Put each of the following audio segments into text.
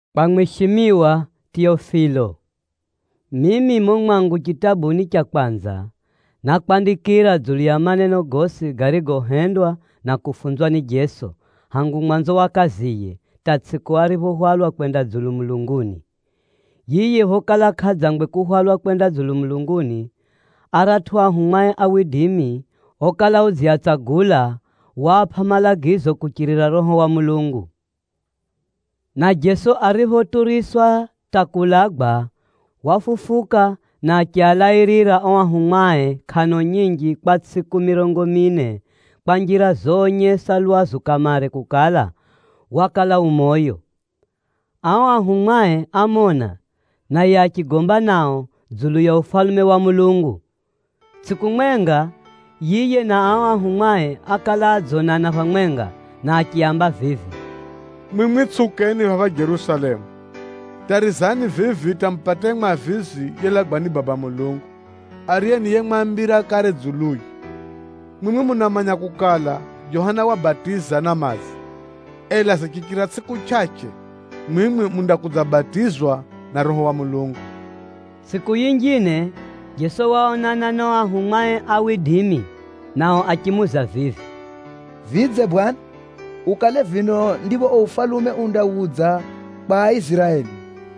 Kwa mwishimiwa Teofilo: Mimi mumo mwangu chitabuni cha kwanza, nákwandikira dzulu ya maneno gosi garigohendwa na kufunzwa ni Jeso, hangu mwanzo wa kaziye, hata tsʼiku ariphohwalwa kwenda dzulu mulunguni. Yiye ariphokala kʼadzangwe kuhwalwa kwenda dzulu mulunguni, aratʼu ahumwae okala udziatsagula, waapʼa malagizo kuchirira Roho wa Mulungu. Na Jeso ariphoturiswa hata kuulagwa, wafufuka na achialairira o ahumwae kʼano nyinji kwa tsʼiku mirongo mine, kwa njira zoonyesa lwazu kamare kukala, wakala u moyo. Ao ahumwae ámona, naye achigomba nao dzulu ya Ufalume wa Mulungu. Tsʼiku mwenga, yiye na ao ahumwae ákala adzonana phamwenga, na achiaamba vivi, “Mwimwi tsʼiukeni phapha Jerusalemu. Tarizani vivi hata mupate yiye Mwavizi yelagwa ni Baba Mulungu, ariye ni yemwambira kare dzuluye. Mwimwi munamanya kukala, Johana wabatiza na madzi, ela zichichira tsʼiku chʼachʼe, mwimwi mundakudzabatizwa na Roho wa Mulungu.” Tsʼiku yinjine, Jeso waonana na ao anafunzie nao achimuuza vivi, “Vidze Bwana, ukale vino ndipho uo ufalume undawudza kwa Aiziraeli?”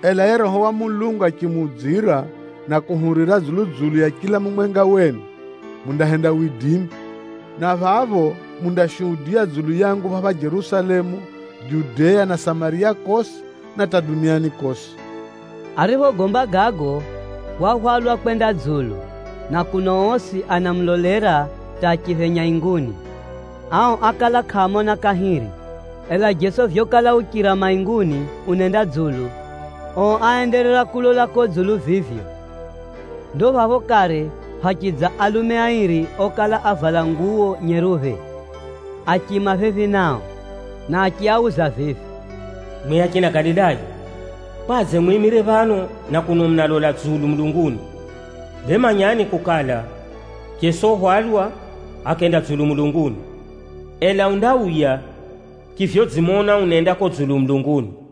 Ela yiye Roho wa Mulungu achimuudzira na kuhurira dzulu-dzulu ya chila mumwenga wenu, mundahenda widimi. Na phapho, mundashuhudiya dzulu yangu phapha Jerusalemu, Judea na Samariya kosi, na hata duniani kosi.” Ariphogomba gago, wahwalwa kwenda dzulu, na kuno osi anamulolera hata achiphenya inguni. Ao ákala kʼaamona kahiri. Ela Jeso vyokala uchira mainguni unenda dzulu, ao áenderera kulola kuko dzulu vivyo. Ndo phapho kare phachidza alume Aa ahadzwao phapha ákala ni malaika. airi okala avala nguwo nyeruphe, achiima phephi nao. Na achiauza vivi, “Mwimwi achina Galilaya! Kwadze mwimire phano na kuno munalola dzulu mulunguni? Bee manyani kukala, Jeso uhwalwa akenda dzulu mulunguni. Ela undauya chivyodzimona unenda kuko dzulu mulunguni.”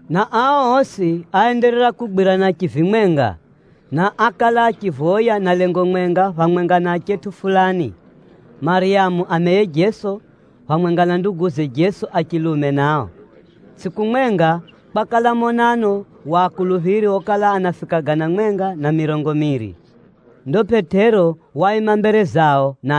Na ao osi áenderera kugwirana chivimwenga, na ákala achivoya na lengo mwenga phamwenga na achetʼu fulani, Maryamu ameye Jeso, phamwenga na nduguze Jeso a chilume nao. Tsʼiku mwenga, kwakala monano wa akuluphiri okala anafika gana mwenga na mirongo miiri. Ndo Pʼetero waima mbere zao na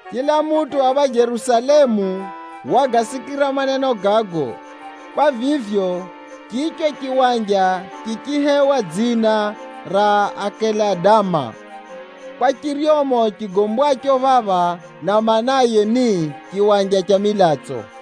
Chila mutʼu phapha Jerusalemu wagasikira maneno gago. Kwa vivyo, chicho chiwanja chichihewa dzina ra “Akelidama” kwa chiryomo chigombwacho phapha, na maanaye ni, “Chiwanja cha Milatso.”)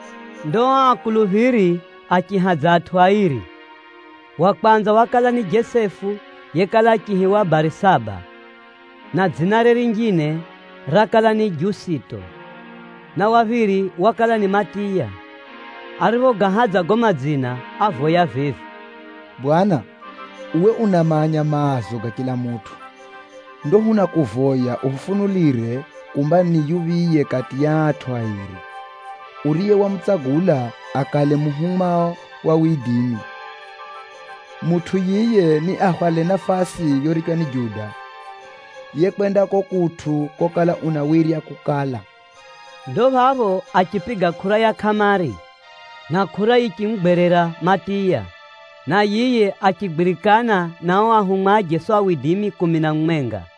Ndo ao akuluphiri achihadza atʼu airi. Wa kwanza wakala ni Jesefu yekala achiihiwa Barisaba, na dzinare rinjine rakala ni Jusito. Na wa phiri wakala ni Matiya. Ariphogahadza gago madzina, ávoya vivi, “Bwana, uwe unamanya maazo ga chila mutʼu. Ndo hunakuvoya uhufunulire kumba ni yuphiye kati ya aa atʼu airi, uriye wamutsagula akale muhumwao. Mutʼu yiye niahwale nafasi yorichwa ni Juda, yekwenda kuko kutʼu kokala unawirya kukala.” Ndo phapho achipiga kʼura ya kʼamari, na kʼura yichimugwerera Matiya, na yiye achigwirikana na ao anafunzi kumi na mumwenga.